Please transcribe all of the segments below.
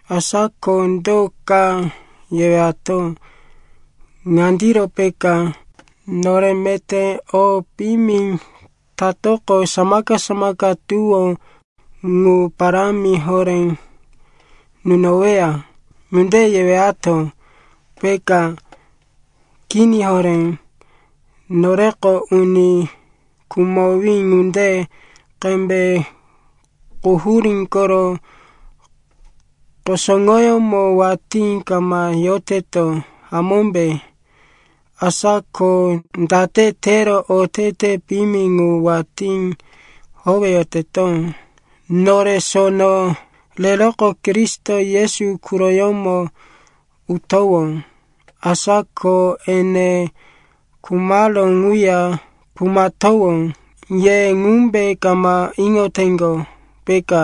Asa ko do ka yewato? Ŋandiro peka, “Nore meté o piyimi tatoqo, samaka-samaka tuwó ŋu parámi horé nunoweya.” Ŋunde yewato, peka? Kini horé. Noreko uni khumowí ŋunde qembe quhurí koro kusuŋoyómo watí kama yoteto, hamómbe? Asa ko date tero otete piyimi ŋu watí howeyoteto? Nore sono reroqo Kristo Yesu quroyómo utowó, asa ko ene khumaró ŋuya khumatowó. Ye ŋumbe kama iŋoteŋgo, peka.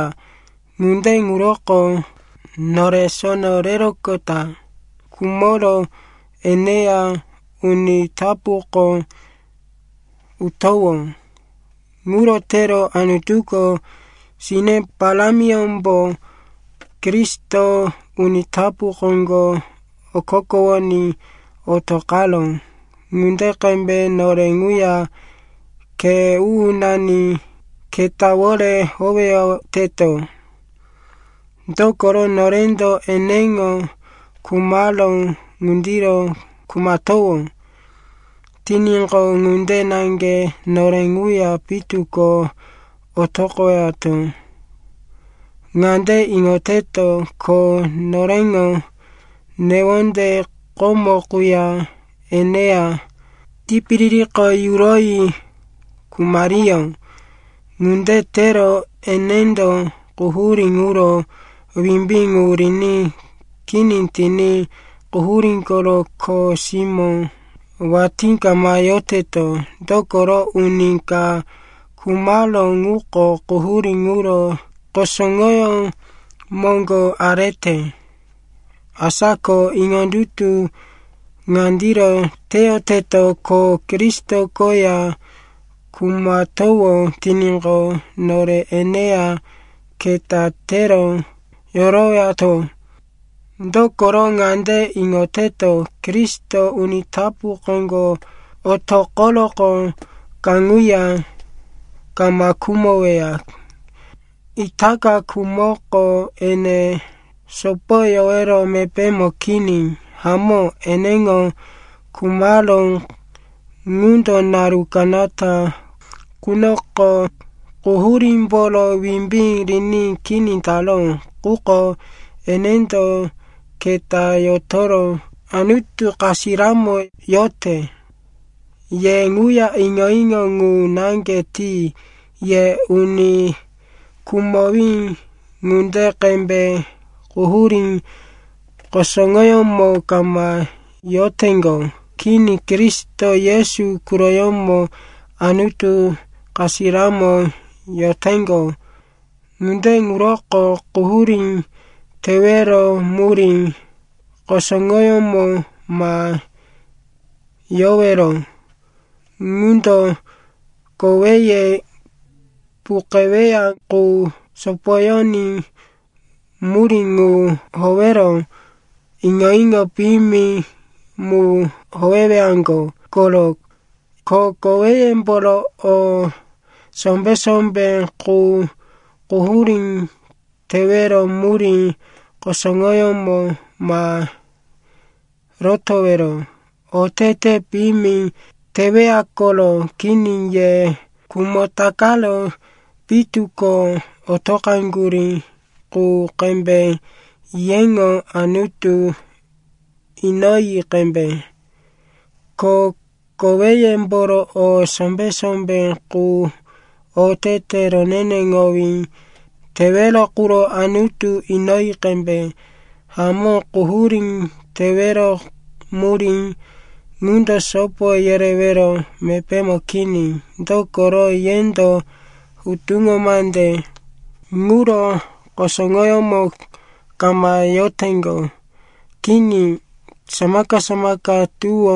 Ŋunde ŋuroko nore sono reroqota khumoro eneya uni tapuko utowó. Ŋuro tero Anutuko sine parámiyómbo Kristo uni tapu koŋgo okokowoní otoqaró ŋunde qembe nore ŋuya khe u-unani ketawore howeyoteto. Dokoro norendo eneŋo khumaró ŋundiro khumatowó tiníqo, ŋunde naŋge nore ŋuya pitu ko otoqowato. Ŋande iŋoteto, ko noreŋo newonde komo quya eneya tipiririko yuroyi khumariyó. Ŋunde tero enendo quhurí ŋuro wimbí ŋu riní kini tiní quhurí koro kho simó watí kama yoteto. Dokoro uni ka khumaró ŋuko quhurí ŋuro kusuŋoyó moŋgo arete. Asa ko iŋondutu ŋandiro teyoteto, ko Kristo koya khumatowó tiníqo, nore eneya keta tero yorowato. Dokoro ŋande iŋoteto, Kristo uni tapu koŋgo otoqoroqo kaŋuya kama khumoweya. Itaka khumoko ene sopoyowero mepémo kini. Hamó, eneŋo khumaró ŋundo naru kanata qunoko quhurímboro wimbí riní kini taró. Quko enendo keta yotoro Anutu kasiramo yorote. Ye ŋuya iŋo-iŋo ŋu naŋge ti. Ye uni khumowí ŋunde qembe quhurí kusuŋoyómo kama yoroteŋgo. Kini, Kristo Yesu quroyómo Anutu kasiramo yoroteŋgo. Ŋunde ŋuroko quhurí tewero murí kusuŋoyómo ma yowero, ŋundo koweye puqeweya qu sopoyoní murí ŋu howero iŋo-iŋo piyimi mu howewaŋgo koro. Ko koweyemboro o sombé-sombé qu quhurí tewero murí kusuŋoyómo ma rotowero, otete piyimi teweya koro. Kini, ye khumo takaro pitu ko otoqaŋgurí qu qembe yeŋo Anutu inoyi qembe, ko koweyemboro o sombé-sombé qu otete roneneŋowí tewero quro Anutu inoyi qembe. Hamó, quhurí tewero murí ŋundo sopo yerewero mepémo kini. Dokoro yendo hutuŋo mande ŋuro kusuŋoyómo kama yoteŋgo. Kini, samaka-samaka tuwó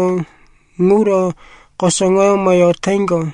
ŋuro kusuŋoyómo yoteŋgo.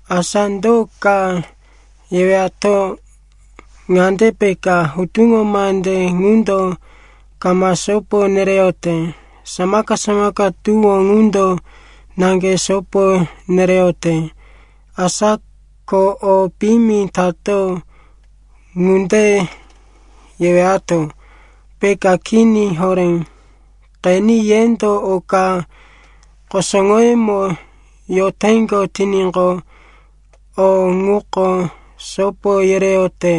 Asa do ka yewato? Ŋande peka, “Hutuŋo mande ŋundo kama sopo nereyote, samaka-samaka tuwó ŋundo naŋge sopo nereyote. Asa ko o piyimi tato.” Ŋunde yewato, peka? Kini horé. Qeni, yendo oka kusuŋoyómo yoteŋgo tiníqo, o ŋuko sopo yereyote.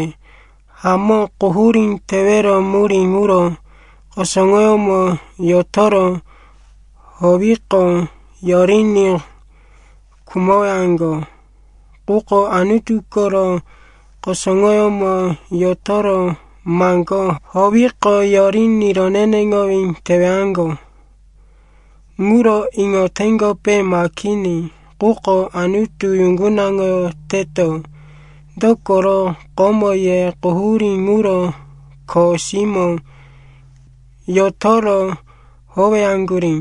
Hamó, quhurí tewero murí ŋuro kusuŋoyómo yotoro howiqo, yoriní khumowaŋgo. Quko Anutu koro kusuŋoyómo yotoro maŋgó howiqo, yoriní roneneŋowí tewaŋgo. Ŋuro iŋoteŋgope ma kini? Quko Anutu yuŋgunaŋoyoteto, dokoro komo ye quhurí ŋuro kho simó yotoro howaŋgurí,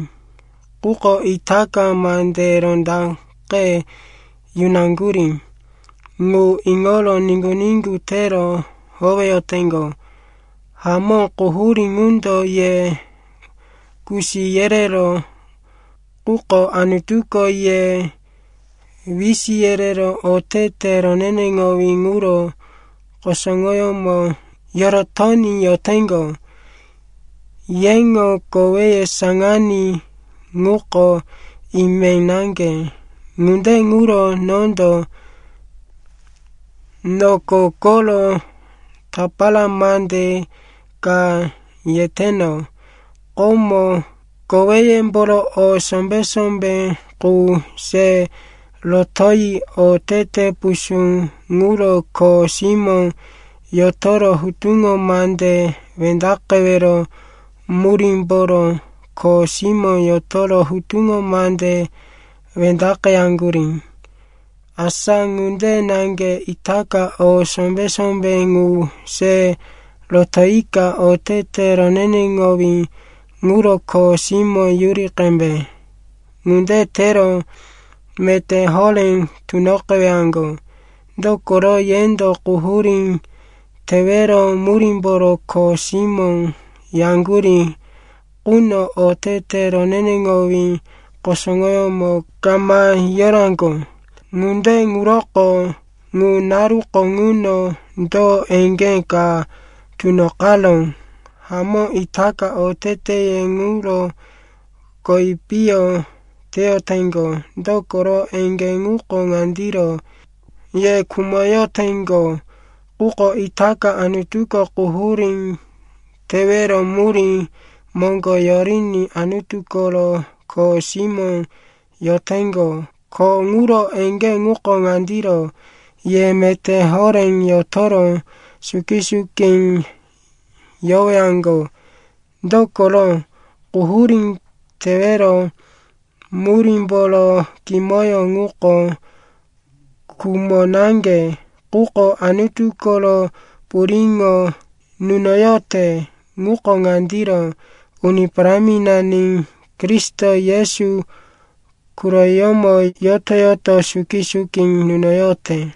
quko itaka mande rondaqe yunaŋgurí ŋu iŋoro niŋgu-niŋgu tero howeyoteŋgo. Hamó, quhurí ŋundo ye kusi yereró, quko Anutuko ye wisi yerero otete roneneŋowí ŋuro kusuŋoyómo yorotoní yoteŋgo. Yeŋo koweye saŋaní ŋuko ime naŋge, ŋunde ŋuro nondo noko koro tapara mande ka yeteno. Komo koweyemboro o sombé-sombé qu se rotoyi otete pusú ŋuro kho simó yotoro hutuŋo mande wendaqewero murímboro kho simó yotoro hutuŋo mande wendaqeyaŋgurí. Asa ŋunde naŋge itaka o sombé-sombé ŋu se rotoyika otete roneneŋowí ŋuro kho simó yuri qembe. Ŋunde tero meté horé tunoqewaŋgo. Dokoro yendo quhurí tewero murímboro kho simó yaŋgurí quno otete roneneŋowí kusuŋoyómo kama yoraŋgo. Ŋunde ŋuroko, ŋu naruko ŋuno do eŋgé ka tunoqaró? Hamó, itaka oteteye ŋuro kowi piyo teyoteŋgo, dokoro eŋgé ŋuko ŋandiro, ye khumoyoteŋgo. Quko itaka Anutuko quhurí tewero murí moŋgo yoriní Anutu koro kho simó yoteŋgo, ko ŋuro eŋgé ŋuko ŋandiro, ye meté horé yotoro suki-suki yorowaŋgo. Dokoro quhurí tewero murímboro kimoyó ŋuko khumo naŋge, quko Anutu koro puriŋo nunoyote ŋuko ŋandiro: Uni Paráminani Kristo Yesu quroyómo yoto-yoto suki-suki nunoyote.